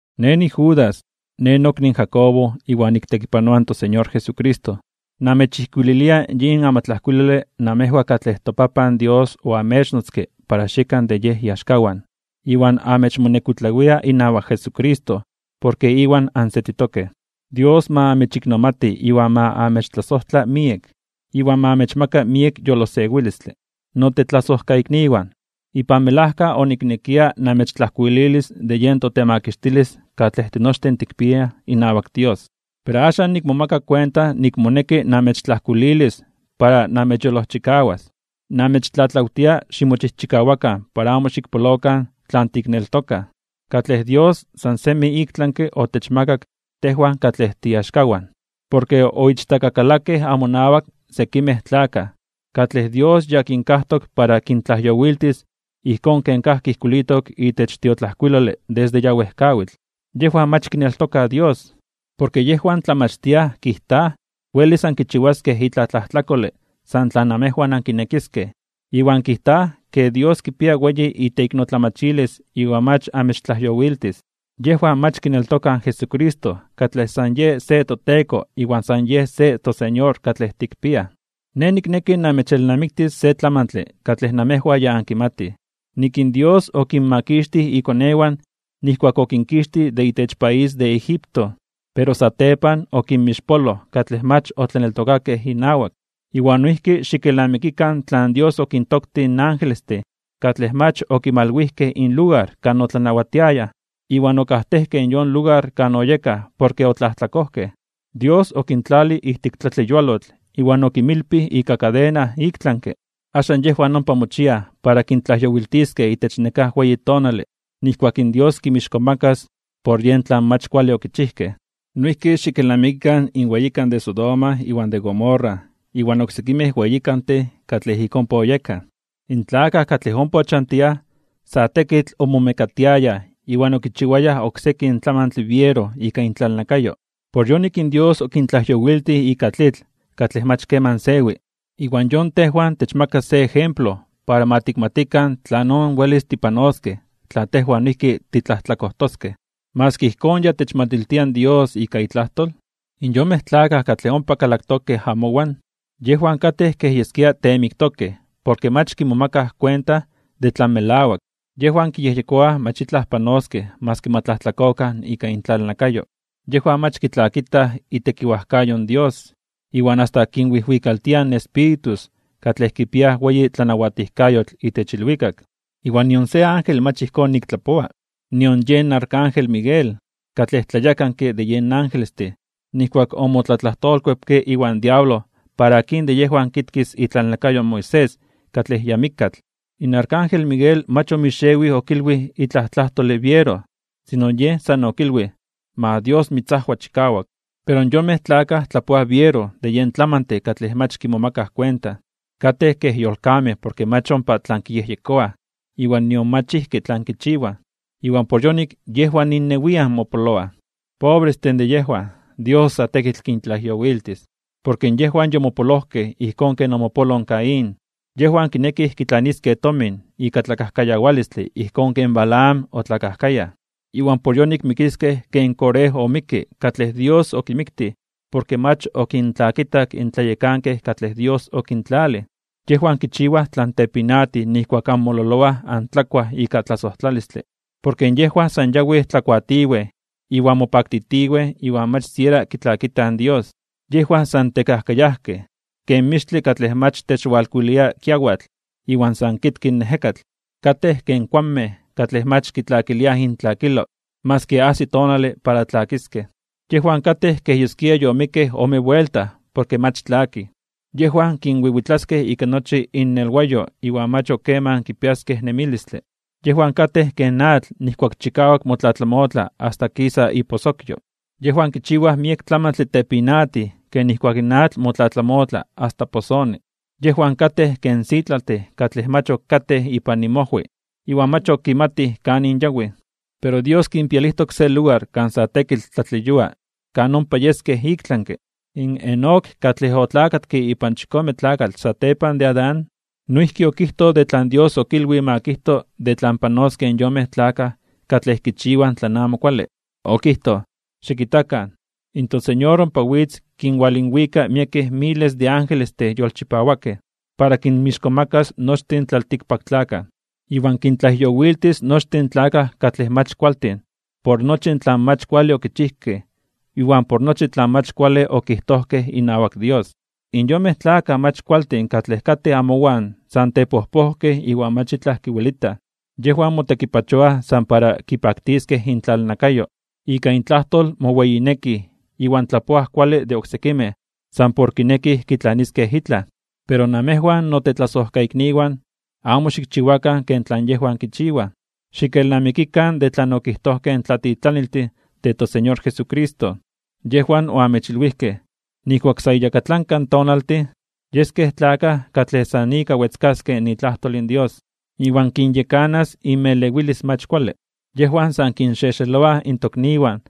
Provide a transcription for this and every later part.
Nej niJudas, nej nokni in Jacobo iwan niktekipanoa in toSeñor Jesucristo. Namechijkuililia yin amatlajkuilole namejwan katlej toPapan Dios oamechnotzke para xiekan de Yej iaxkawan, iwan amechmonekuitlawia inawak Jesucristo porke Iwan ansetitokej. Dios ma amechiknomati iwan ma amechtlasojtla miek, iwan ma amechmaka miek yolosewilistle. Notetlasojkaikniwan, ipan melajka oniknekia namechtlajkuililis de yen totemakixtilis katlej tinochtin tikpiaj inawak Dios. Pero axan nikmomaka kuenta nik moneki namechtlajkuililis para namechyolojchikawas. Namechtlatlawtia ximochijchikawakan para amo xikpolokan tlan tikneltokaj, katlej Dios san semi iktlanke (ik tlami) otechmakak tejwan katlej tiiaxkawan. Porke oichtakakalakej amonawak sekimej tlakaj, katlej Dios ya kinkajtok para kintlajyowiltis ijkón ken kajki ijkuilitok itech tiotlajkuilole desde ya wejkawitl. Yejwan mach kineltokaj Dios. Porke yejwan tlamachtiaj kijtaj welis ankichiwaskej itlaj tlajtlakole san tlan amejwan ankinekiskej, iwan kijtaj ke Dios kipia weyi iteiknotlamachilis iwan mach amechtlajyowiltis. Yejwan mach kineltokaj in Jesucristo katlej san yen se toTeko iwan san yen se toSeñor katlej tikpiaj. Nej nikneki namechelnamiktis se tlamantle katlej namejwan ya ankimatij: nik in Dios okinmakixtij ikonewan nijkuak okinkixtij de itech país de Egipto, pero satepan okinmixpoloj katlej mach otlaneltokakej inawak. Iwan noijki xikelnamikikan tlan Dios okintoktij in angelestin katlej mach okimalwijkej inlugar kan otlanawatiayaj, iwan okajtejkej yon lugar kan oyekaj porke otlajtlakojkej. Dios okintlalij ijtik tlatleyualotl iwan okinmilpij ika kadena iktlanke (ik tlami). Axan yejwan ompa mochiaj para kintlajyowiltiskej itech nekáj weyi tonale nijkuak in Dios kinmixkomakas (kintzonmanas) por yen tlan mach kuale okichijkej. Noijki xikelnamikikan in weyikan de Sodoma iwan de Gomorra iwan oksekimej weyikantin katlej ik ompa oyekaj. In tlakaj katlej ompa ochantiaj sa tekitl omomekatiayaj iwan okichiwayaj oksekin tlamantle biero ika intlalnakayo. Por yonik in Dios okintlajyowiltij ika tlitl katlej mach keman sewi, iwan yon tejwan techmaka se ejemplo para ma tikmatikan tlanon welis tipanoskej tla tejwan noijki titlajtlakojtoskej. Maski ijkón ya techmatiltia in Dios ika itlajtol, in yonmej tlakaj katlej ompa kalaktokej amowan, yejwan katej kej yeskia teemiktokej porke mach kimomakaj kuenta de tlan melawak, yejwan kiyejyekoaj mach itlaj panoskej maski ma tlajtlakokan ika intlalnakayo. Yejwan mach kitlakitaj itekiwajkayo in Dios, iwan asta kinwijwikaltiaj in espíritus katlej kipiaj weyi tlanawatijkayotl itech ilwikak. Iwan nion se ángel mach ijkón nik tlapoa. Nion yen arcángel Miguel, katlej tlayekanke de yen angelestin, nijkuak omotlatlajtolkuepke iwan diablo para akin de yejwan kitkis itlalnakayo in Moisés katlej ya mikkatl, in arcángel Miguel mach omixewij okilwij itlaj tlajtole biero, sino yej san okilwij: “Ma Dios mitzajwa chikawak.” Pero yonmej tlakaj tlapoaj biero de yen tlamantin katlej mach kimomakaj kuenta. Katej kej yolkamej porke mach ompa tlan kiyejyekoaj iwan nion mach ijki tlan kichiwaj. Iwan por yonik yejwan innewian mopoloaj. ¡Pobrestin de yejwan! Dios sa tekitl kintlajyowiltis. Porke yejwan yomopolojkej ijkón ken omopoloj in Caín. Yejwan kinekij kitlaniskej tomin ika tlakajkayawalistle ijkón ken Balaam otlakajkayaj. Iwan por yonik mikiskej ken Coré omikke katlej Dios okimiktij porke mach okintlakitak in tlayekankej katlej Dios okintlalij. Yejwan kichiwaj tlan tepinatij nijkuak anmololoaj antlakuaj ika tlasojtlalistle. Porke yejwan san yawij tlakuatiwej iwan mopaktitiwej iwan mach siera kitlakitaj in Dios. Yejwan san tekajkayajkej ken mixtle katlej mach techwalkuilia kiawatl iwan san kitki in ejekatl. Katej ken kuanmej katlej mach kitlakiliaj intlakilo maski ajsi tonale para tlakiskej. Yejwan katej kej yeskia yomikkej ome buelta porke mach tlakij, yejwan kinwiwitlaskej ika nochi innelwayo iwan mach ok keman kipiaskej nemilistle. Yejwan katej ken atl nijkuak chikawak motlatlamotla asta kisa iposokyo. Yejwan kichiwaj miek tlamantle tepinatij ken nijkuak in atl motlatlamotla asta posoni. Yejwan katej ken sitlaltin katlej mach ok katej ipan inmojwi iwan mach ok kimatij kanin yawij. Pero Dios kinpialijtok se lugar kan sa tekitl tlatleyua kan ompa yeskej iktlanke (ik tlami). Enoc katlej otlakatke ipan chikome tlakatl satepan de Adán, noijki okijtoj de tlan Dios okilwij ma kijto de tlan panoskej in yonmej tlakaj katlej kichiwaj tlan amo kuale. Okijtoj: “Xikitakan, in toSeñor ompa witz kinwalinwika miek miles de angelestin yolchipawakej, para kinmixkomakas (kintzonmanas) nochtin in tlaltikpaktlakaj. Iwan kintlajyowiltis nochtin in tlakaj katlej mach kualtin por nochi tlan mach kuale okichijkej iwan por nochi tlan mach kuale okijtojkej inawak Dios.” In yonmej tlakaj mach kualtin katlej katej amowan san tepojpojkej iwan mach itlaj kiwelitaj. Yejwan motekipachoaj san para kipaktiskej intlalnakayo. Ika intlajtol moweyinekij iwan tlapoaj kuale de oksekimej san por kinekij kitlaniskej itlaj. Pero namejwan notetlasojkaikniwan, amo xikchiwakan ken tlan yejwan kichiwaj. Xikelnamikikan de tlan okijtojkej in tlatitlaniltin de toSeñor Jesucristo. Yejwan oamechilwijkej: “Nijkuak sa iyakatlanka tonaltin, yeskej tlakaj katlej san ika wetzkaskej itlajtol in Dios, iwan kinyekanas inmelewilis mach kuale.” Yejwan san kinxexeloaj in tokniwan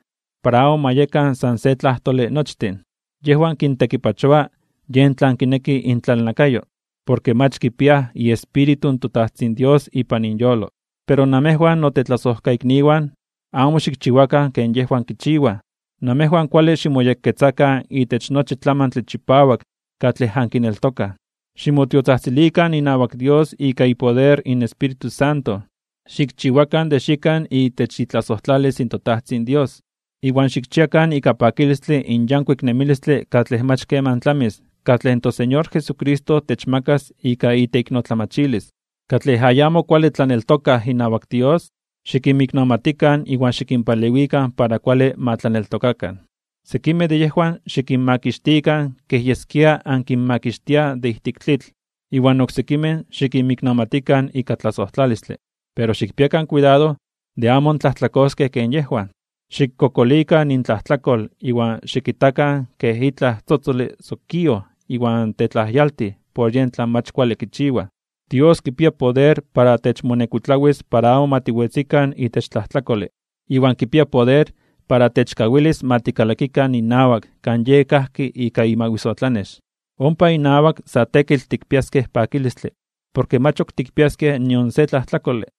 para amo ma yekan san se tlajtole nochtin. Yejwan kintekipachoa yen tlan kineki intlalnakayo, porke mach kipiaj iEspíritu in toTajtzin Dios ipan inyolo. Pero namejwan notetlasojkaikniwan, amo xikchiwakan ken yejwan kichiwaj. Namejwan kuale ximoyekketzakan itech nochi tlamantle chipawak katlej ankineltokaj. Ximotiotzajtzilikan inawak Dios ika ipoder in Espíritu Santo. Xikchiwakan de xiekan itech itlasojtlalis in toTajtzin Dios. Iwan xikchiakan ika pakilistle in yankuik nemilistle katlej mach keman tlamis katlej toSeñor Jesucristo techmakas ika iteiknotlamachilis. Katlej ayamo kuale tlaneltokaj inawak Dios, xikinmiknomatikan iwan xikinpalewikan para kuale ma tlaneltokakan. Sekimej de yejwan xikinmakixtikan kej yeskia ankinmakixtiaj de ijtik tlitl. Iwan oksekimej xikinmiknomatikan ika tlasojtlalistle. Pero xikpiakan kuidado de amo antlajtlakoskej ken yejwan. Xikkokolikan intlajtlakol iwan xikitakan kej itlaj tzotzole sokíoj iwan tetlajyaltij por yen tlan mach kuale kichiwaj. Dios kipia poder para techmonekuitlawis (techkuidaros) para amo ma tiwetzikan itech tlajtlakole, iwan kipia poder para techkawilis ma tikalakikan inawak kan Yej kajki ika imawisotlanex. Ompa inawak sa tekitl tikpiaskej pakilistle porke mach ok tikpiaskej nion se tlajtlakole.